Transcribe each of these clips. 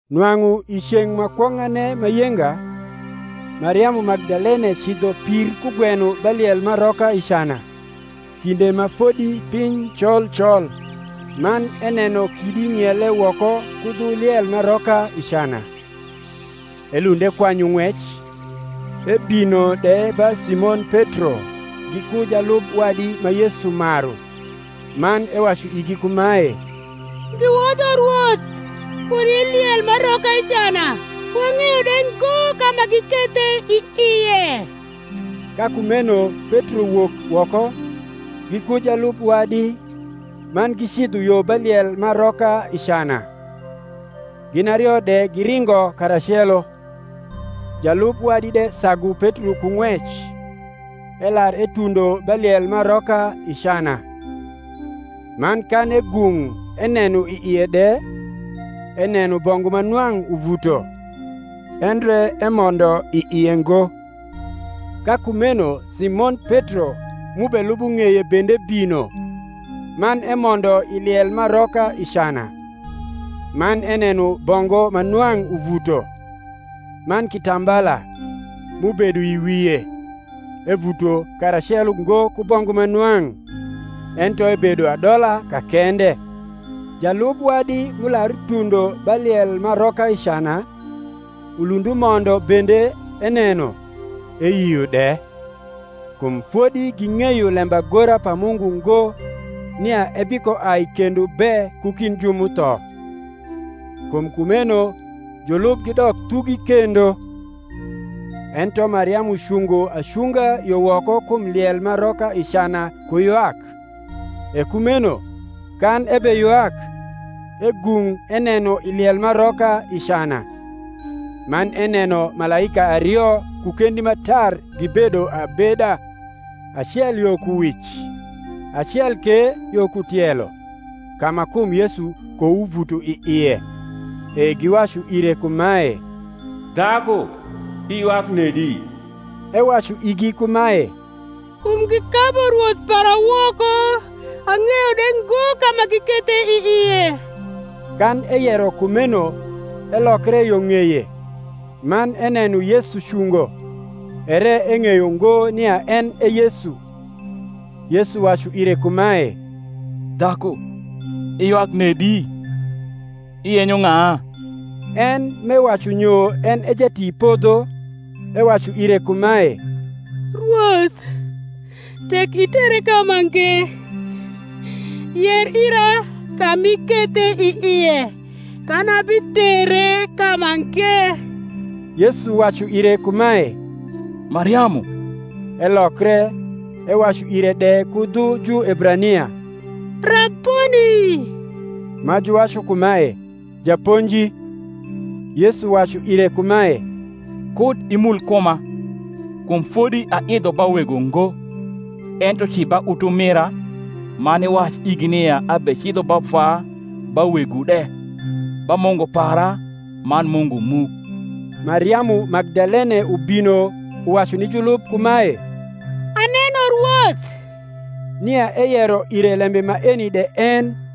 Nwang’u i ceng’ ma kwong’ane ma yenga, Mariamu Magdalene cidho pir kugweno ba liel m’aroka i cana, kinde ma fodi piny col col, man eneno kidi ng’iele woko ku dhu liel m’aroka i cana. Elund ekwanyu ng’wec, ebino de ba Simon Petro, giku jalub wadi ma Yesu maru, man ewacu igi kumae, Giwodho Rwoth kud i liel m’aroka i cana, wang’eyo de ngo ka ma gikethe i ie. Ka kumeno Petro wok woko, giku jalub wadi, man gicidho yo ba liel m’aroka i cana. Gin ario de giringo karacelo: jalub wadi de sagu Petro ku ng’wec, elar etundo ba liel m’aroka i cana; man kan egung’ eneno i ie de, eneno bongu ma nwang’ uvuto; endre emondo i ie ngo. Ka kumeno Simon Petro m’ubelubo ng’eye bende bino, man emondo i liel m’aroka i cana; man eneno bongu ma nwang’ uvuto, man kitambala, m’ubedo i wie, evuto karacelo ngo ku bongu ma nwang’, ento ebedo adola ka kende, Jalub wadi m’ular utundo ba liel m’aroka i cana, ulund umondo bende eneno, eyio de. Kum fodi ging’eyo lembagora pa Mungu ngo, nia ebikoai kendo be ku kind ju m’utho. Kum kumeno julub gidok thugi kendo. Ento Mariamu cungo acunga yo woko kum liel m’aroka i cana ku ywak: e kumeno, kan ebeywak, egung’ eneno i liel m’aroka i cana; man eneno malaika ario ku kendi ma tar gibedo abeda, acel yo ku wic, acel ke yo ku tielo, ka ma kum Yesu kouvuto i ie. E giwacu ire kumae, Dhaku, iywak nedi? Ewacu igi kumae, Kum gikabu Rwoth para woko, ang’eyo de ngo ka ma gikethe i ie. Kan eyero kumeno elokre yo ng’eye, man eneno Yesu cungo, ere eng’eyo ngo nia en e Yesu. Yesu wacu ire kumae, Dhaku, iywak nedi? iyenyo ng’a? En m’ewacu nyo en e jatipodho, ewacu ire kumae, Rwoth, tek itere kamange, yer ira ka m’ikethe i ie, kan abitere kamange. Yesu wacu ire kumae, Mariamu. Elokre, ewacu ire de ku dhu Juebrania, Raboni; ma juwacu kumae, Japonji. Yesu wacu ire kumae, Kud imul kuma; kum fodi aidho ba Wego ngo; ento ci ba utumira, man iwac igi nia abecidho ba Vwa ba Wegwu de, ba Mungu para man Mungu mu. Mariamu Magdalene ubino uwacu ni julub kumae, Aneno Rwoth; nia eyero ire lembe maeni de en.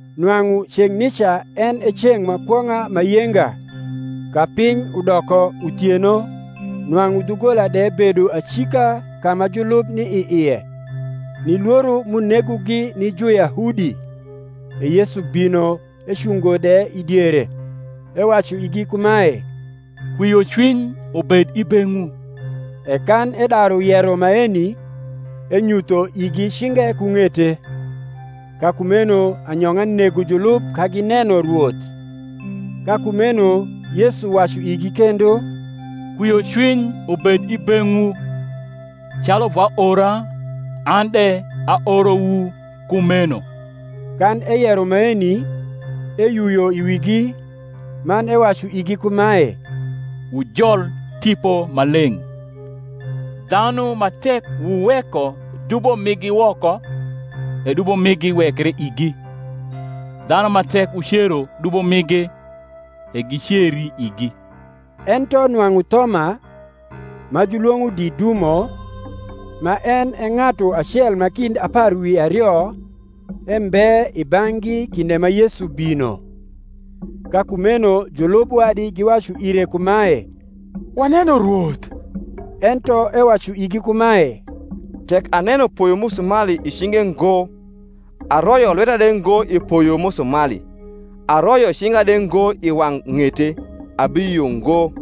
Nwang’u ceng’ nica en e ceng’ ma kwong’a ma yenga, ka piny udoko uthieno, nwang’u dhugola de bedo acika ka ma julub ni i ie, ni lworo m’unegogi ni Juyahudi, e Yesu bino ecungo de i diere, ewacu igi kumae, Kwiocwiny ubed i beng’wu. E kan edaru yero maeni, enyutho igi cinge ku ng’ete. Ka kumeno anyong’a nego julub ka gineno Rwoth. Ka kumeno Yesu wacu igi kendo, Kwiocwiny ubed i beng’wu; calu Vwa ora, an de aorowu kumeno. Kan eyero maeni, eyuyo i wigi, man ewacu igi kumae, Wujol Tipo Maleng’: dhanu ma tek wuweko dubo migi woko, e dubo migi wekre igi; dhanu ma tek wucero dubo migi, e giceri igi. Ento nwang’u Thoma, ma julwong’o Didumo, ma en e ng’atu acel ma kind apar wi ario, embe i bang’gi kinde ma Yesu bino. Ka kumeno julub wadi giwacu ire kumae, Waneno Rwoth. Ento ewacu igi kumae, Tek aneno poyo musumali i cinge ngo, aroyo lweta de ngo i poyo musumali, aroyo cinga de ngo i wang’ ng’ete, abiyio ngo.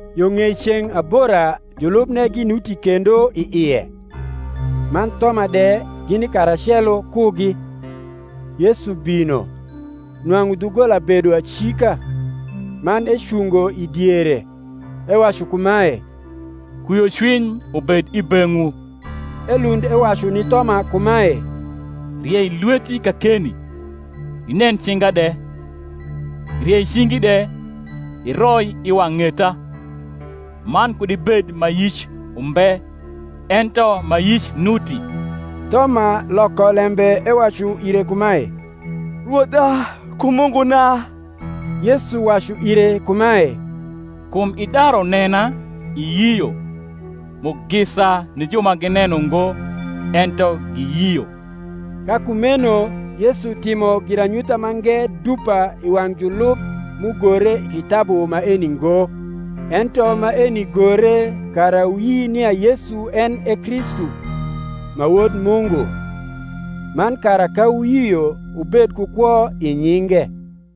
Yo ng’ei ceng’ abora julubne ginuti kendo i ie, man Thoma de gini karacelo kugi. Yesu bino, nwang’u dhugola bedo acika, man ecungo i diere, ewacu kumae, Kwiocwiny ubed i beng’wu. Elund ewacu ni Thoma kumae, Riei lweti kakeni, inen cinga de; riei cingi de, iroi i wang’ ng’eta: man kud ibed ma yic umbe, ento ma yic nuti. Thoma loko lembe ewacu ire kumae, Rwodha ku Munguna. Yesu wacu ire kumae, Kum idaru nena, iyio: mugisa ni ju ma gineno ngo, ento giyio. Ka kumeno Yesu timo giranyutha mange dupa i wang’ julub m’ugore i kitabu maeni ngo: ento maeni gore kara wuyi nia Yesu en e Kristu, ma Wod Mungu; man kara ka wuyio wubed ku kwo i nyinge.